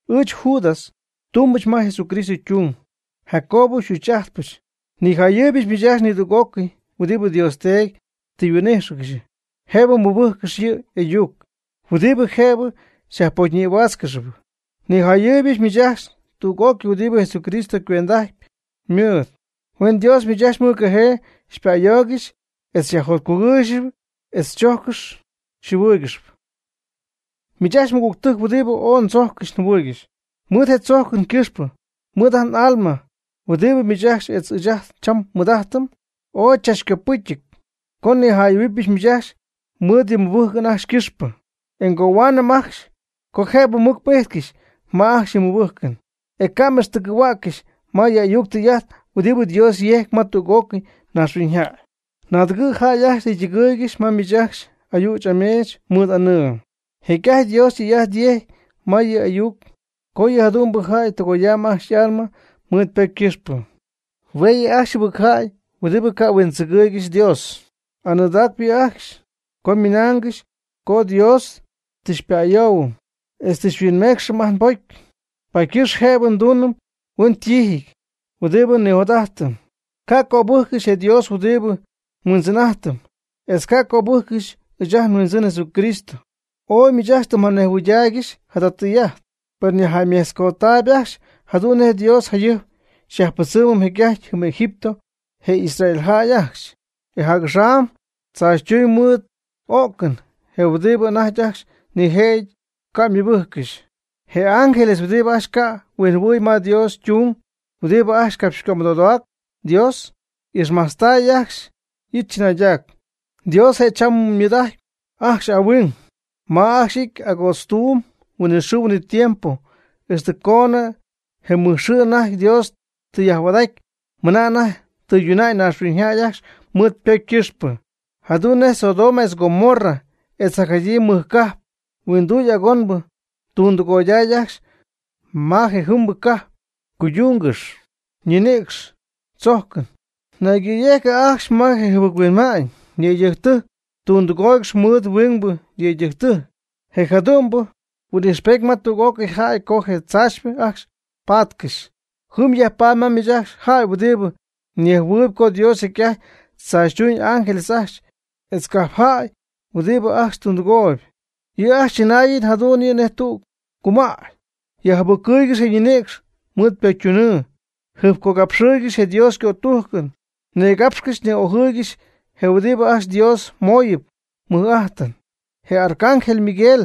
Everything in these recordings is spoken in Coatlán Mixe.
Ɨɨch Judas, tumbɨch ma Jesucristo ytung, Jacobo xy'uch'ajtpɨch. Nijayɨɨybɨch miich ajcxy nidüg'ócɨy huɨdibɨ Dios Teedy tɨ huin'ijxcɨxy jëbɨ mɨbɨjccɨxy yɨ' y'ayuc huɨdibɨ jëbɨ xyajpocyñïhuaatzcɨxy. Nijayɨɨybɨch miich ajcxy tüg'ócɨy huɨdibɨ Jesucristo ycuend'aty ymɨɨd. Huen Dios miich ajcxy mɨjcajee xypa'ayoogɨxy etz xyajjotcugɨɨygɨxy etz chojccɨxy xyjɨhuɨɨygɨxy. Miich ajcxy mɨgügtɨjc huɨdibɨ ooy ndzocyɨch njɨhuɨ̈yɨch, mɨɨd je nïdzoocɨn ycɨxpɨ mɨɨd ajt n'alma huɨdibɨ miich ajcxy etz ɨɨch cham nmɨɨd'ajtɨm, ooy chachycopɨcɨty co nijayɨ̈huɨbɨch miich ajcxy mɨɨd yɨ mɨbɨjcɨn ajcxy ycɨxpɨ, e ngohuanɨɨyb ajcxy co jëbɨ mɨc m'ijtcɨxy ma ajcxy yɨ mɨbɨjcɨn e ca' m'ixtɨgɨ̈hua'ccɨxy ma yɨ ayuc tɨy'ajt huɨdibɨ Dios yejc ma tüg'ócɨy naaxhuiñyjäy. Naagɨty jäy ajcxy tɨ ytɨgɨɨygɨxy ma miich ajcxy ayüch ameech mɨɨd anɨɨ. Jecy'ajty Dios tɨy'ajt yejcy ma yɨ' y'ayuc co yɨ jadu'mbɨ jäy tɨgoyam ajcxy y'alma mɨɨd ypocy ycɨxpɨ. Hue' yɨ' ajcxy jɨbɨc jäy huɨdibɨ ca' huindzɨgɨɨygɨxy Dios. Anɨɨdaacp yɨ' ajcxy co ymɨnaangɨxy co Dios tɨ xypa'ayoohuɨm etz tɨ xyhuinmeecxɨm ajt nbocy paady ycɨxpɨ jëbɨ nduunɨm huen tiijɨty huɨdibɨ nijot'ajtɨm. Ca' cöbɨjccɨxy je Dios huɨdibɨ nHuindzɨn'ajtɨm, etz ca' cöbɨjccɨxy ɨɨch ajt nHuindzɨn Jesucristo. Oy miich ajcxy tɨ mjanejhuɨydaaygɨxy jada tɨy'ajt, per nyajjäymetzcodamy ajcxy jadu'n nej Dios jayɨjp yajpɨdzɨmy jecy'ajty jɨm Egipto je Israel jäy ajcxy, e jac'axam tzaachytuuñ mɨɨd o'cɨn je huɨdibɨ anajty ajcxy nijëjɨty ca' ymɨbɨjccɨxy. Je ángeles huɨdibɨ ajcxy ca' yhuɨ'my ma Dios ytung huɨdibɨ ajcxy capxycömɨdodacy Dios, y'ixmajtztay ajcxy y'it chɨnaydac. Dios je' cham mɨɨd'ajtp ajcxy ahuing. Mach ajcxy y'ity agoodztuuby huinɨxɨɨ huinɨtiempo ixtɨ coonɨ je mɨj xɨɨ anajty Dios tɨ yajhuaad'aty, mɨna anajty tɨyduna'ñ naaxhuiñyjäy ajcxy mɨɨd ypocy ycɨxpɨ. Jadu'n nej Sodoma etz Gomorra etz jacjadyii mɨj cajp huinduy agonbɨ ytundɨgoyday ajcxy ma jejɨmbɨ cajp ycuydungɨxyp ñinïcx chojcɨn, naygɨ̈yejcɨ ajcxy ma je jɨbɨc-huinma'ñ. Yëydɨjctɨjc ytundɨgooygɨxy mɨɨd huingbɨ yëydɨjc. Je' jadu'n huɨ'm ijxpejt ma tüg'ócɨy jäy co je tzaachypɨ ajcxy paatcɨxy. Jɨm yajpaady ma miich ajcxy jäy huɨdibɨ nejhuɨɨyb co Dios jecy'ajty tzaachytuuñ ángeles ajcxy etz cajp jäy huɨdibɨ ajcxy tundɨgooy. Yɨ' ajcxy chɨnaayɨn jadu'n yɨ' nej tüg cumäy. Yajjɨbɨccɨɨygɨxy je ñinïcx mɨɨd pocytunɨɨ. Jɨjpcogapxɨɨygɨxy je Dios ycotujcɨn, nigapxcɨxy ni'ojɨɨygɨxy je huɨdibɨ ajcxy Dios mooyɨp mɨj'ajtɨn. Je arcángel, Miguel,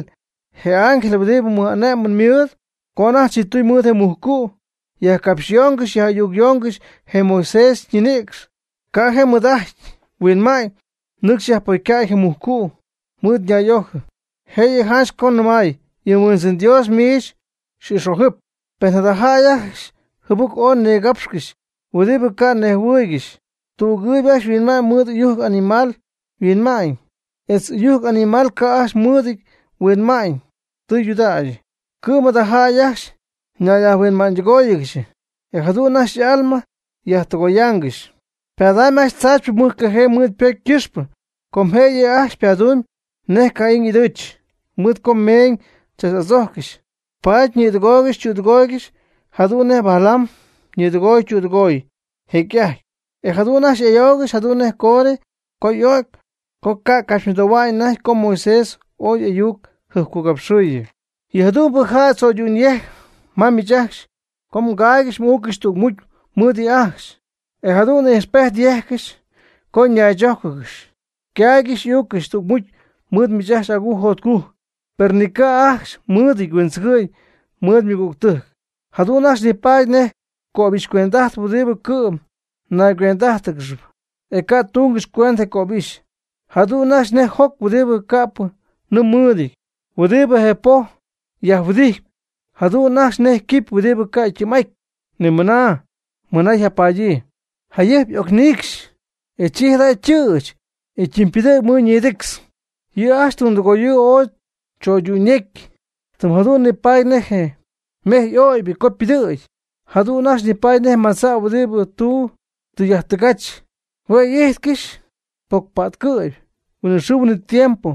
je ángel huɨdibɨ mɨj'ane'mɨn mɨɨd, co anajty ychiptuñ mɨɨd je mujcu', yajcapxyoongɨxy yaj'ayucyoongɨxy je Moisés ñinïcx, ca'p je' mɨɨd'ajty huinma'ñ nɨcxy yajpocycäy je mujcu' mɨɨd nay'ojɨɨ. Jëyɨ janch co nɨmay: “Yɨ Huindzɨn Dios miich xy'ix'ojɨp.” Per jada jäy ajcxy jɨbɨc ooy nigapxcɨxy huɨdibɨ ca' nejhuɨɨygɨxy. Tügɨɨyb ajcxy yhuinma'ñ mɨɨd ɨyujc animal yhuinma'ñ, etz ɨyujc animal ca' ajcxy mɨɨdɨty huinma'ñ tɨydudägyɨ. Cɨ'm jada jäy ajcxy ñayyajhuinma'ñydɨgóoyɨgɨxy, e jadu'n ajcxy y'alma yajtɨgoyaangɨxy. Ypadamyb ajcxy tzaachypɨ mɨjcajee mɨɨd pocy ycɨxpɨ com je' yɨ' ajcxy ypadumyb nej Caín y'ɨdɨɨch. Mɨɨd co meeñ tzach'adzojccɨxy, paady ñɨɨdɨgooygɨxy ytüdɨgooygɨxy jadu'n nej Balaam ñɨɨdɨgoy ytüdɨgoy jecy'ajty, e jadu'n ajcxy y'ayoogɨxy jadu'n nej Coré, co y'o'cy co ycacapxymɨdohuañ anajty co Moisés oy y'ayucjɨjpcogapxɨɨyɨ. Yɨ jadu'mbɨ jäy tzo'ydu'n yejcp ma miich ajcxy co mgaaygɨxy m'uuccɨxy tügmucy mɨɨd yɨ' ajcxy, e jadu'n ijxpejt yejccɨxy co mnaychójcɨgɨxy. Caaygɨxp uuccɨxp tügmucy mɨɨd miich ajcxy agujc jotcujc per ni ca' ajcxy mɨɨdɨty huindzɨgɨ'ñ mɨɨd ymɨgügtɨjc. Jadu'n ajcxy nipaady nej cöbixycuend'ajtpɨ huɨdibɨ cɨ'm ñaygüend'ájtɨgɨxyp, e ca' tungɨxy cuendɨ je cöbixy. Jadu'n ajcxy nej joc huɨdibɨ ca'pɨ nɨɨ mɨɨdɨty, huɨdibɨ je poj yajhuɨdijtɨp. Jadu'n ajcxy nej quipy huɨdibɨ ca' ytɨɨm'aty mɨna yjapadyii, jayɨjp y'ocniicxy, e chi jada ytɨɨch, e ytɨmypɨdɨ̈gy mɨɨd ñidictz. Yɨ' ajcxy ytundɨgoyɨɨ ooy cho'ydu'n yecy, tɨm jadu'n nipaady nej je mejy y'oobɨ̈gy co ypɨdɨ̈gy. Jadu'n ajcxy nipaady nej madza' huɨdibɨ ytu' tɨ yajtɨgach. Hue' y'ijtcɨxy pocypa'tcɨ'py huinɨxɨɨ huinɨtiempo,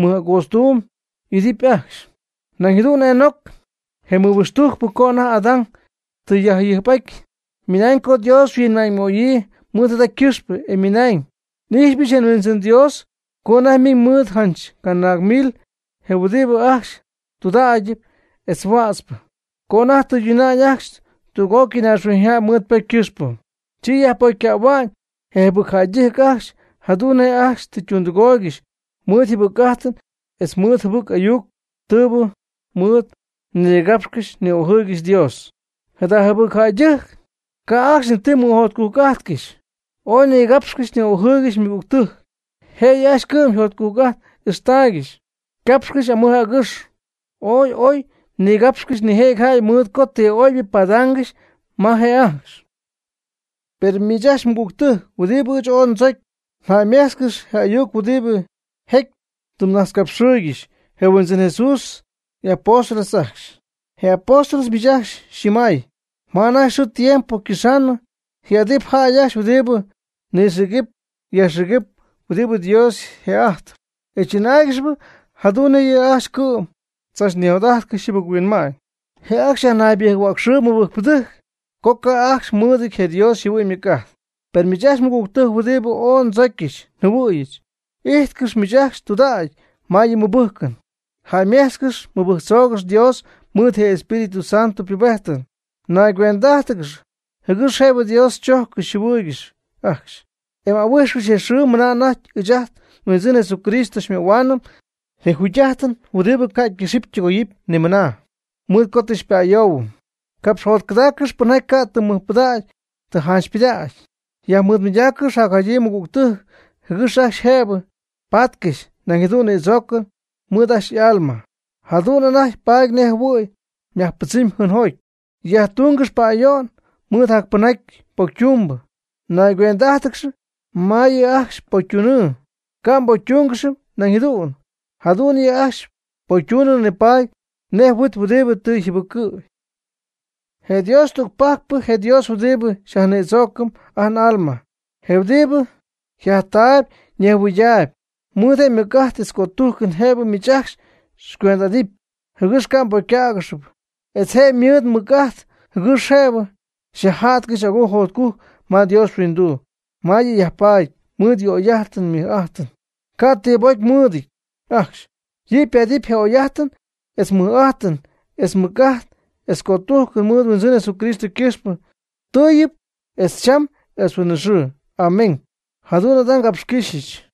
mɨj'agootztuuyb y'idɨpy ajcxy. Nañ jadu'n Enoc, je mɨhuixtujcpɨ co anajty Adán tɨ yjayɨjp'aty, ymɨnañ co Dios yhuinma'ñymooyɨ mɨɨd jada ycɨxpɨ, e ymɨnañ: “N'ijxɨch je Huindzɨn Dios co anajty ymiiñ mɨɨd janch canaag mil je huɨdibɨ ajcxy tudägyɨty etz huätzɨp. Co anajty tɨyduna'ñ ajcxy tüg'ócɨy naaxhuiñyjäy mɨɨd ypocy ycɨxpɨ, chi yajpocycähua'ñ je jɨbɨc jäydɨjc ajcxy jadu'n nej ajcxy tɨ ytundɨgooygɨxy mɨɨd yjɨbɨcjäy'ajt etz mɨɨd jɨbɨc ayuc tɨɨbɨ mɨɨd nigapxcɨxy ni'ojɨɨygɨxy Dios.” Jada jɨbɨc jäydɨjc ca' ajcxy ni ti mɨjotcujc'ajtcɨxy, ooy nigapxcɨxy ni'ojɨɨygɨxy ymɨgügtɨjc. Jëyɨ ajcxy ycɨ'm jotcujc'ajt ixtaaygɨxy. Ycapxcɨxy amɨj agɨx. Ooy oy nigapxcɨxy nijëjɨty jäy mɨɨd co ti oybɨ padaangɨxy ma je' ajcxy. Per miich ajcxy mɨgügtɨjc huɨdibɨ ɨɨch ooy ndzocy, jäymejtzcɨx je ayuc huɨdibɨ jécyɨp tɨ najtzcapxɨɨygɨxy je Huindzɨn Jesucristo y'apóstoles ajcxy. Je apóstoles miich ajcxy xyñɨmay: “Ma anajty xɨɨ tiempo ycɨxaanɨ, ji'adɨp jäy ajcxy huɨdibɨ nɨxïgɨpy yajxïgɨpy huɨdibɨ Dios yje'ajtpy, e chɨnáaygɨxɨpy jadu'n nej yɨ' ajcxy cɨ'm tzachnijot'ajtcɨxy jɨbɨc-huinma'ñ.” Je' ajcxy yajnaybɨjc-huäcxɨɨb mɨbɨjcpɨdɨjc co ca' ajcxy mɨɨdɨty je Dios yjɨhuɨ'ñ ymɨc'ajt. Per miich ajcxy mɨgügtɨjc huɨdibɨ ooy ndzocyɨch njɨhuɨ̈yɨch, ijtcɨx miich ajcxy tudägy ma yɨ mmɨbɨjcɨn. Jäymejtzcɨx mɨbɨjctzoogɨx Dios mɨɨd je Espíritu Santo ypubejtɨn. Naygüend'ájtɨgɨx jɨgɨx jëbɨ Dios xychojccɨxy xyjɨhuɨɨygɨxy ajcxy, e ahuijxcɨx je xɨɨ mɨna anajty ɨɨch ajt nHuindzɨn Jesucristo xymöhuaanɨm je jugy'ajtɨn huɨdibɨ ca' ycɨxɨpy ytɨgoyɨpy ni mɨna mɨɨd co tɨ xypa'ayoohuɨm. Capxjotcɨdaaccɨx pɨnjaty ca' ti mɨjpɨdägy janchypɨdägy. Yajmɨɨdmɨydaaccɨx jacjadyii mɨgügtɨjc jɨgɨx ajcxy jëb paatcɨxy nañ jadu'n nïdzoocɨn mɨɨd ajcxy y'alma. Jadu'n anajty paady nej jɨhuɨ̈y myajpɨdzɨmgɨxy jɨɨnjoty. Yajtungɨx pa'ayo'n mɨɨd jacpɨnjaty pocytumbɨ. Naygüend'ájtɨgɨx ma yɨ' ajcxy ypocytunɨɨ, ca' mbocytungɨxy nañ jadu'n. Jadu'n yɨ' ajcxy ypocytunɨɨ nipaady nej huit huɨdibɨ tɨ yjɨbɨccɨ'y. Je Dios tügpajcpɨ, je Dios huɨdibɨ xyajnïdzoocɨm ajt n'alma, je huɨdibɨ yjajtaayb ñejhuɨydaayb, ymɨɨd je' mɨc'ajt etz cötujcɨn jëbɨ miich ajcxy xycuend'adɨpy jɨgɨx ca' mbocycägɨxɨpy, etz je' ymɨɨd mɨc'ajt jɨgɨx jëbɨ xyajja'tcɨxy agujc jotcujc ma Dios yhuinduu, ma yɨ' yajpaady mɨɨd y'oy'ajtɨn ymɨj'ajtɨn ca' ti mbocymɨɨdɨty ajcxy. Yɨ' paatɨp je oy'ajtɨn etz mɨj'ajtɨn etz mɨc'ajt etz cötujcɨn mɨɨd nHuindzɨn Jesucristo ycɨxpɨ, tɨɨyɨp etz cham etz huinɨxɨɨ. Amén. Jadu'n ngapxycɨ́xyɨch.